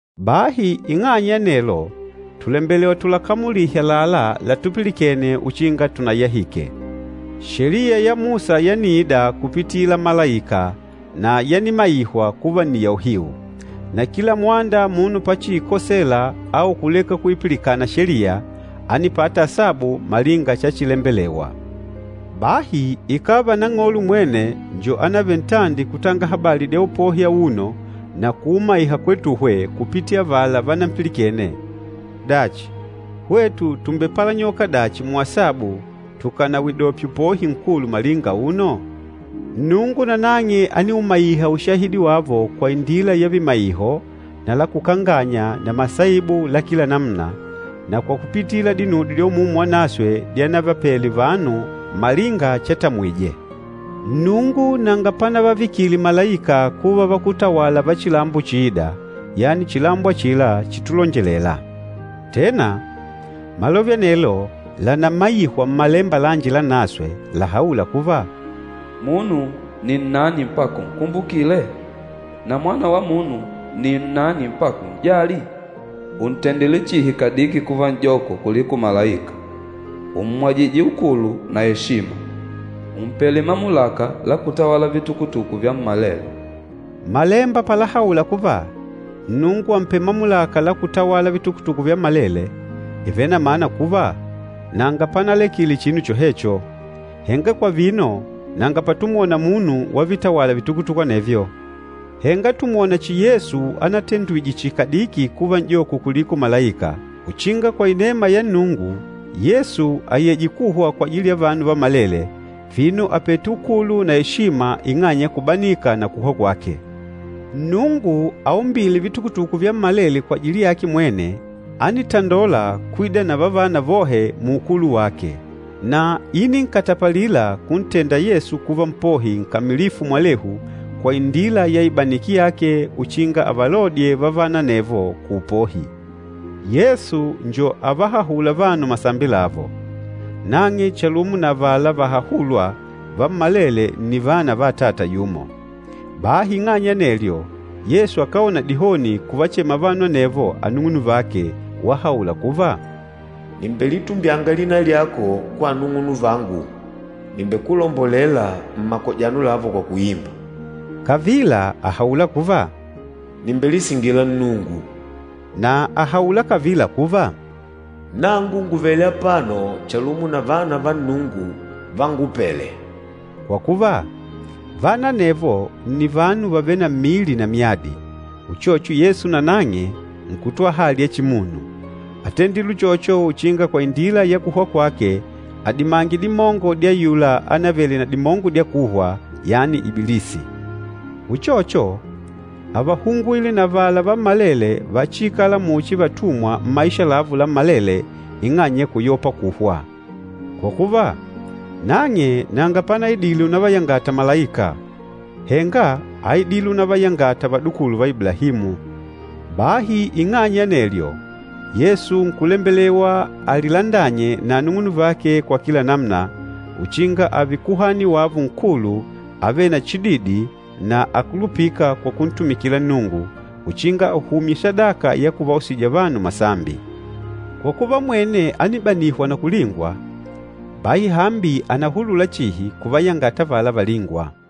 Bahi ing'anya ya anelo, tùlembelewa tulakamulihe àlalá latupilikene uchinga tunayahike. Sheliya ya Musa yaniida kupitila malaika na yanimaihwa kuva nni ya uhiu. Na kila mwanda munu pachiikosela au kuleka kuipilikana Sheliya, ánipata asabu malinga chachilembelewa. Bahi ikàva Nang'olo mwene njo ánavele ntandi kutanga habali dya upohi auno na kuumaiha kwetuhwe kupitila avala vanampilikene, dachi hwetu tùmbepalanyoka dachi muasabu tukànawidopye upohi nkulu malinga auno? Nnungu nanang'e ániumaiha ushahidi wavo kwa indila ya vimaiho na la kukanganya na masaibu la kila namuna, na kwa kupitila dinudyo dya Umumu Wanaswe dyavapele vanu malinga chatamwije. Nnungu nanga panavavikile malaika kuva vakútawala va chilambo chiîda, yani chilambo achila chitulonjelela. Tena, malove anelo lànamaihwa Mmalemba lanji Lanaswe lahaûla kuva, “Munu ni nnani mpaka unkumbukile? Na mwana wa munu ni nnani mpaka un'jali? Ùntendile chihi kadiki kuva n'joko kuliko malaika, ùmmwajije ukulu na eshima. Ùmpele mamulaka la kutawala vitukutuku vyammalele.” Malemba palahaula kuva, Nnungu àmpele mamulaka la kutawala vitukutuku vyammalele, ìvele na mana kuva, nanga panalekile chinu chohecho. Henga kwa vino, nanga patumwona munu wavitawala vitukutuku anevyo. Henga tùmwona chihi Yesu anatendwije chihi kadiki kuva n'joko kuliko malaika, uchinga kwa inema ya Nnungu, Yesu ayeje kuhwa kwajili ya vanu vammalele, vino àpete ukulu na eshima ing'anya ya kubanika na kuhwa kwake. Nnungu aumbîle vitukutuku vyammalele kwajili yake mwene, ánitandola kwida na vavana vohe muukulu wake. Na íninkatapalila kuntenda Yesu kuva Mpohi nkamilifu mwalehu kwa indila ya ibaniki yake uchinga avalodye vavana anevo kuupohi. Yesu njo avahahûla vanu masambi lavo. Nang'e chalumo na avala vahahûlwa, vammalele nni vana va Atata yumo. Bahi ing'anya ya anelyo, Yesu akáona dihoni kuvachema vanu anevo anung'unuvake, wahaula kuva, “Nìmbelitumbyanga lina lyako kwa anung'unuvangu, nìmbekulombolela mmakojano lavo kwa kuimba.” Kavila àhaula kuva, “Nìmbelisingila Nnungu.” Na àhaula kavila kuva, “Nangu ngùvele apano chalumo na vana va Nnungu vángupèlè.” Kwa kuva, vana anevo nni vanu vàvele na mmili na myadi, uchocho Yesu nanang'e nkùtwala hali ya chimunu. Átendile uchocho uchinga kwa indila ya kuhwa kwake, adimange dimongo dya ayula ánavele na dimongo dya kuhwa, yani Ibilisi. Uchocho, ávahungwile na avala vammalele vachiikâla muchi vatumwa mmaisha lavo lammalele ing'anya ya kuyopa kuhwa. Kwa kuva, nang'e nanga panaidile unavayangata malaika, henga áidile unavayangata vadukulu va Iblahimu. Bahi ing'anya ya anelyo, Yesu nkulembelewa alilandanye na anung'unuvake kwa kila namuna, uchinga ààve Kuhani wavo Nkulu avêle na chididi na akulupîka kwa kuntumikila Nnungu, uchinga ahumye sadaka ya kuvausija vanu masambi. Kwa kuva mwene ánibanihwa na kulingwa, bahi hambi ànahulula chihi kuvayangata avala valîngwa.